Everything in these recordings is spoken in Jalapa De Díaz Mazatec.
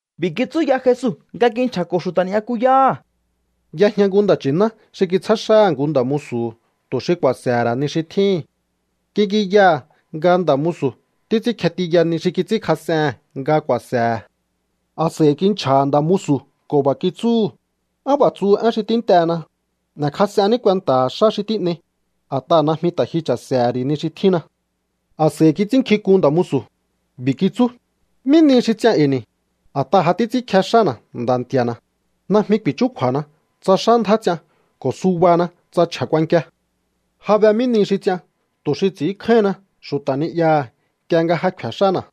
B'i̱ kitsú ya Jesu nga kinchja̱ko̱ xu̱ta̱ ni'yakuyáha̱: —Y'ejña nku nda̱ nchi̱ná xi kitsjá xáha̱ nku nda̱ musu̱hu̱ tu̱ xi ku̱a̱se̱he̱ ra̱ ni xi tjíhi̱n. Kik'inyaha̱ nga nda̱ musu̱ títs'ínkje tiya ni xi kits'ínkjas'ehe̱n nga ku̱a̱se̱he̱. A̱s'a̱i kinchja̱ha̱ nda̱ musu̱ ko̱ b'a̱ kitsúhu̱: “¿Á b'a̱ tsu én xi tínt'ehena? N'e̱kjas'enní kuenta̱ha̱ xá xi tín'ei, a̱t'aha̱ najmi ta̱ ji cha̱se̱he̱ ri̱ ni xi tjínna.” A̱s'a̱i kits'ínnkjink'un nda̱ musu̱. B'i̱ kitsú: “¿Mí nihi xi ts'ian e̱i̱ ni̱, a̱t'aha̱ ja títs'ínkje xána̱ nda̱ nti̱a̱na̱? Najmi ku̱i̱chúkju̱a̱na tsa xá ndjá ts'ian ko̱ subana tsa chje̱ kuankia. Ja be mí nihi xi ts'ian tu̱ xi ts'i̱ínkjáíhinna xu̱ta̱ ni'yaha̱ nk'ie nga ja kje̱ xána̱.”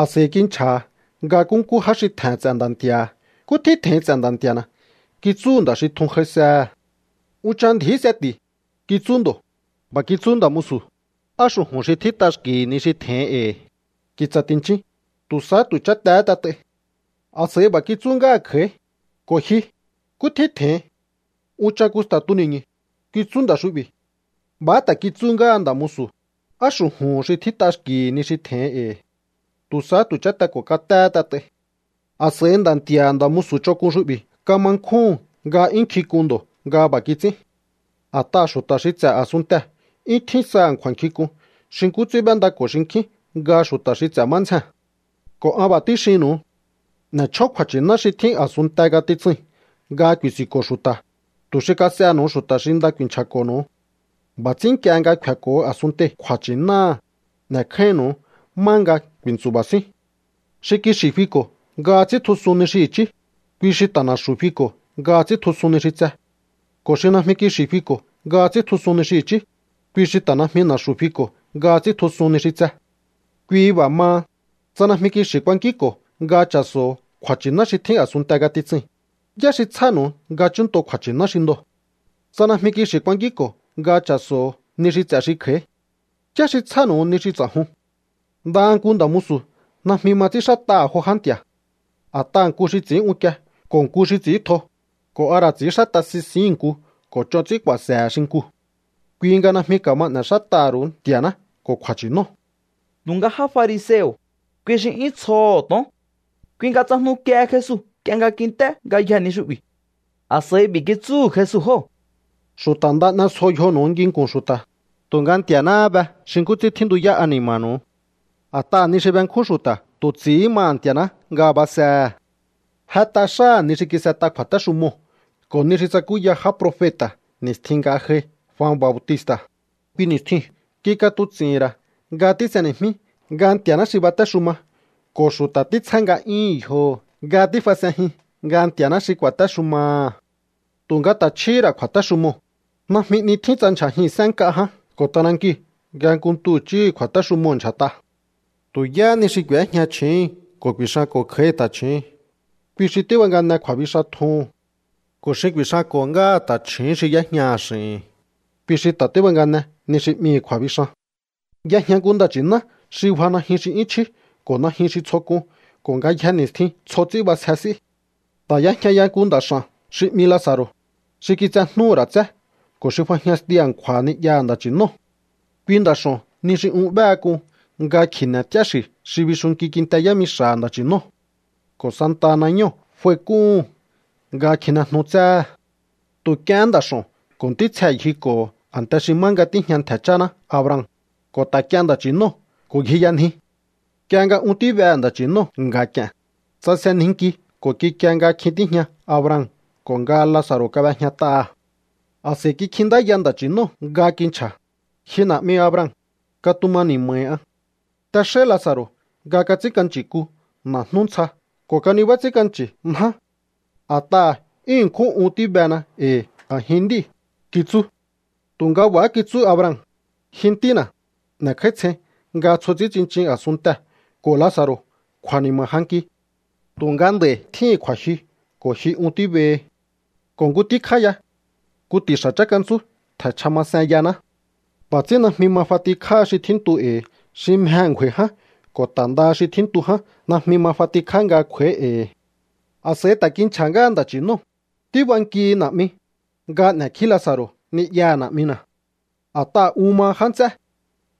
’A̱s'a̱i kinchja̱ha̱ nga nkúnkú já xi tje̱he̱n ts'e̱ nda̱ nti̱a̱ha̱. “¿Nkú tjín tje̱hin ts'e̱ nda̱ nti̱a̱na̱?”, kitsúhu̱ nda̱ xi tjun j'aisehe̱. “Unchan ndji̱í seti̱”, kitsú ndo̱. B'a̱ kitsú nda̱ musu̱: “Á xu̱ju̱n xi tjít'a xki̱hi̱ ni xi tje̱hin e̱i̱. Ki̱tsa̱ ti̱nchin, tu̱ sahá tu̱ chátehé t'et'ai.” A̱s'a̱i b'a̱ kitsú ngáha̱ kj'a̱í: “Ko̱ ji, ¿nkú tjín tje̱hin?” “Unchan kusta̱ tuni̱ñu̱”, kitsú nda̱ xu'bi̱. B'a̱há ta̱ kitsú ngáha nda̱ musu̱: “Á xu̱ju̱n xi tjít'a xki̱hi̱ ni xi tje̱hin e̱i̱. Tu̱ sahá tu̱ cháte ko̱ katéhé t'et'ai.” ’A̱s'a̱i nda̱ nti̱a̱ha̱ nda̱ musu̱ ch'onk'un xu'bi̱ kama nkjúhu̱n nga 'yún nkjink'un ndo̱ nga b'a̱ kits'ín. A̱t'aha̱ xu̱ta̱ xi ts'e̱ a̱sunntee̱ 'yún tjín saha̱ kju̱a̱nkjink'un xi nkú ts'ín b'éndako̱ xinkjín nga xu̱ta̱ xi ts'e̱ má ndzjee̱n. Ko̱ an b'a̱ tíxinnu̱u. N'e̱ chjón kju̱a̱nchi̱ná xi tjín a̱sunnte ngatitsui̱n nga ku̱i̱si̱nko̱ xu̱ta̱, tu̱ xi kas'ehe̱nu̱u xu̱ta̱ xi nda ku̱i̱nchja̱ko̱nu̱u. B'a̱ ts'ín nk'ie nga kfe̱ko̱ a̱sunntei̱ kju̱a̱nchi̱náha̱, n'e̱kjáínnu̱u má nga ku̱i̱ntsu̱ba̱ síún. ’Xi kixi̱ fiko̱ nga ts'íntjusun ni xi i̱chí, kui xi ta̱ na̱xu̱ fiko̱ nga ts'íntjusun ni xi tse. Ko̱ xi najmi kixi̱ fiko̱ nga ts'íntjusun ni xi i̱chí, kui xi ta̱ najmi na̱xu̱ fiko̱ nga ts'íntjusun ni xi tse. Kui b'a̱ maha, tsa najmi kixi̱ ku̱a̱nkínko̱o nga cha̱so̱ho̱ kju̱a̱nchi̱ná xi tjín a̱sunnte ngatitsui̱n, ¿yá xi tsjánu̱u nga chúnnto kju̱a̱nchi̱ná xi ndoo̱? Tsa najmi kixi̱ kuankínko̱o nga cha̱so̱ho̱ ni xi ts'e̱ xi kj'a̱í, ¿yá xi tsjánu̱u ni xi ts'a̱jun? Ndaha nku nda̱ musu̱ najmi ma ts'ínxát'aha̱ jo já nti̱a̱. A̱t'aha̱ nku xi ts'i̱ín unkie ko̱ nku xi ts'i̱íntjo, ko̱ a ra̱ ts'i̱ínxát'a sisihi̱n nku ko̱ ch'on ts'ín ku̱a̱se̱he̱ xinkuu̱. Kui nga najmi ka̱ma n'e̱xát'aha̱ ru̱u Nti̱a̱ná ko̱ kju̱a̱nchi̱nóo̱. Tu̱nga já fariseo̱, kui xi 'yún tsjoho̱ to̱on. Kui nga tsajnukiehe Jesu nk'ie nga kint'é ngayjee̱ ni xu'bi̱. A̱s'a̱i b'i̱ kitsúhu̱ Jesu jóo̱: —Xu̱ta̱ nda n'esjo yjonu̱u nginku̱n xu̱ta̱, tu̱nga Nti̱a̱náhá be xi nkú ts'ín tjíntuyá ani̱ma̱nu̱u. A̱t'aha̱ ni xi benkjún xu̱ta̱ tu̱ ts'i̱hí maha̱ Nti̱a̱ná nga basehe̱. Jet'a xáha̱ ni xi kis'et'a kju̱a̱téxumoo̱ ko̱ ni xi tsakúya já profeta̱ ni̱stjin nga j'ai Jua Bautista̱. Kui ni̱stjiu̱n kik'atuts'i̱hi̱n ra̱ nga tís'eni̱jmí nga Nti̱a̱ná xi batéxuma ko̱ xu̱ta̱ títsjá nga'yúhu̱n yjoho̱ nga tífas'enjin nga Nti̱a̱ná xi ku̱a̱téxumaha̱. Tu̱nga ta̱ chjíhi̱ ra̱ kju̱a̱téxumoo̱. Najmi 'ni tjín tsa ndyja̱jihi̱n sén nk'a ján ko̱ t'anankiu̱ nga nku ntu i̱chíhi̱ kju̱a̱téxumoo̱ ndyja̱t'a. ’Tu̱ yáhá ni xi k'u̱éjña chju̱úhu̱n ko̱ ku̱i̱xanko̱ kj'a̱í ta̱chju̱ún, kui xi tíbangane kju̱a̱bixan tjuhu̱n. Ko̱ xi ku̱i̱xanko̱ ngáha ta̱chju̱ún xi y'éjñaha̱ x'i̱hi̱n, kui xi ta̱ tíbangane ni xi 'mihi̱ kju̱a̱bixan. ’Y'ejña nku nda̱ nchi̱ná xi bja najyun xi 'yún chjí ko̱ najyun xi tsjo k'un ko̱ ngayje ni̱stjin tsjo ts'ín b'asje s'í. Ta̱ y'ejña ya nku nda̱ x'a̱n xi 'mi Laza̱ro̱, xi kitsejnúhú ra̱ tsé ko̱ xi fajñastiu a̱nkju̱a̱ ni'yaha̱ nda̱ nchi̱nóo̱. Kui nda̱ x'o̱n ni xi un b'éhe k'un nga kji̱ne̱ t'íá xi̱ xi bixuntunkí kinte yámixa̱ha̱ nda̱ nchi̱nóo̱. Ko̱ santaha nañóo̱ f'aik'úhu̱n nga kjinejnu tséhe̱. Tu̱ k'iehén nda̱ x'o̱n ko̱ ntítsjee̱ ngjiko̱ho̱ a̱nte xi má nga tíjña ntje̱ cháná Abraham, ko̱ ta̱ k'ien nda̱ nchi̱nóo̱ ko̱ ngjiyanji. Nk'ie nga un tíbehe̱ nda̱ nchi̱nóo̱ nga̱k'i̱e̱n, tsasenjinki ko̱ kikie nga kjin tíjña Abraham ko̱ nga Laza̱ro̱ kab'ejñat'aha̱. ’A̱s'a̱i kikjintáya nda̱ nchi̱nóo̱ nga kinchja̱: “Ji na̱'mi Abraham, katuma ni̱ma̱hi an. T'exáí Laza̱ro̱ nga kats'ínk'anchi̱ku na̱jnú ntsja ko̱ kanibá ts'ínk'anchi̱ njá. A̱t'aha̱ 'yún ṉkjún un tíbena e̱i̱ a̱jin nd'íi̱”, kitsú. Tu̱nga b'a̱há kitsú Abraham: “Ji ntína̱, n'e̱kj'áítsjein nga tsjo ts'ín tsinchin a̱sunntee̱ ko̱ Laza̱ro̱ kju̱a̱ni̱ma̱ j'anki. Tu̱nga nd'a̱i̱ tjíhi̱n kju̱a̱jyu ko̱ ji un tíbehi. Ko̱ nku tíkjá ya. Nku ti̱xa̱ chánkantsú tje̱nchja masen yaná. B'a̱ ts'ín najmi ma f'atikjáha xi tjíntu e̱i̱ xi mjehe̱ ngju̱a̱i̱ ján ko̱ ta̱ ndaha xi tjíntu ján najmi ma f'atikjá nga kj'u̱a̱í e̱i̱.” ’A̱s'a̱i ta̱ kinchja̱há ngáha nda̱ nchi̱nóo̱: “Tíbankihi, na̱'mi, nga n'e̱kjí Laza̱ro̱ ni'yaha̱ na̱'mina̱. A̱t'aha̱ un maha já nts'é.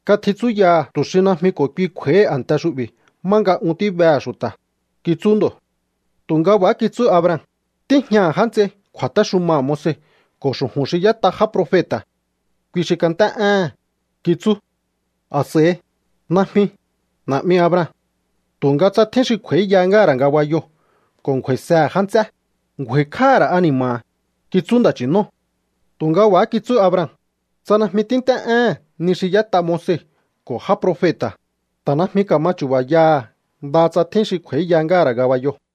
Katjitsúyaha̱ tu̱ xi najmi ko̱ kui kj'u̱a̱íhi a̱nte xu'bi̱ má nga un tíbehe̱ xu̱ta̱”, kitsú ndo̱. Tu̱nga b'a̱há kitsú Abraham: “Tíjñaha̱ já nts'ei kju̱a̱téxumaha̱ Moise ko̱ xu̱ju̱n xi y'ét'a já profeta̱. Kui xi kant'é éhe̱n”, kitsú. A̱s'a̱i: “Najmi, na̱'mi Abraham. Tu̱nga tsa tjín xi kj'u̱a̱íya ngáha̱ ra̱ ngabayoo̱ ko̱ ngju̱a̱i̱sehe̱ já nts'é, ngju̱a̱i̱kj'áha̱ ra̱ ani̱ma̱ha̱”, kitsú nda̱ nchi̱nóo̱. Tu̱nga b'a̱há kitsú Abraham: “Tsa najmi tínt'é éhe̱n ni xi y'ét'a Moise ko̱ já profeta̱, ta̱ najmi ka̱ma chu̱ba̱yaha̱ ndaha tsa tjín xi kj'u̱a̱íya ngáha̱ ra̱ ngabayoo̱.”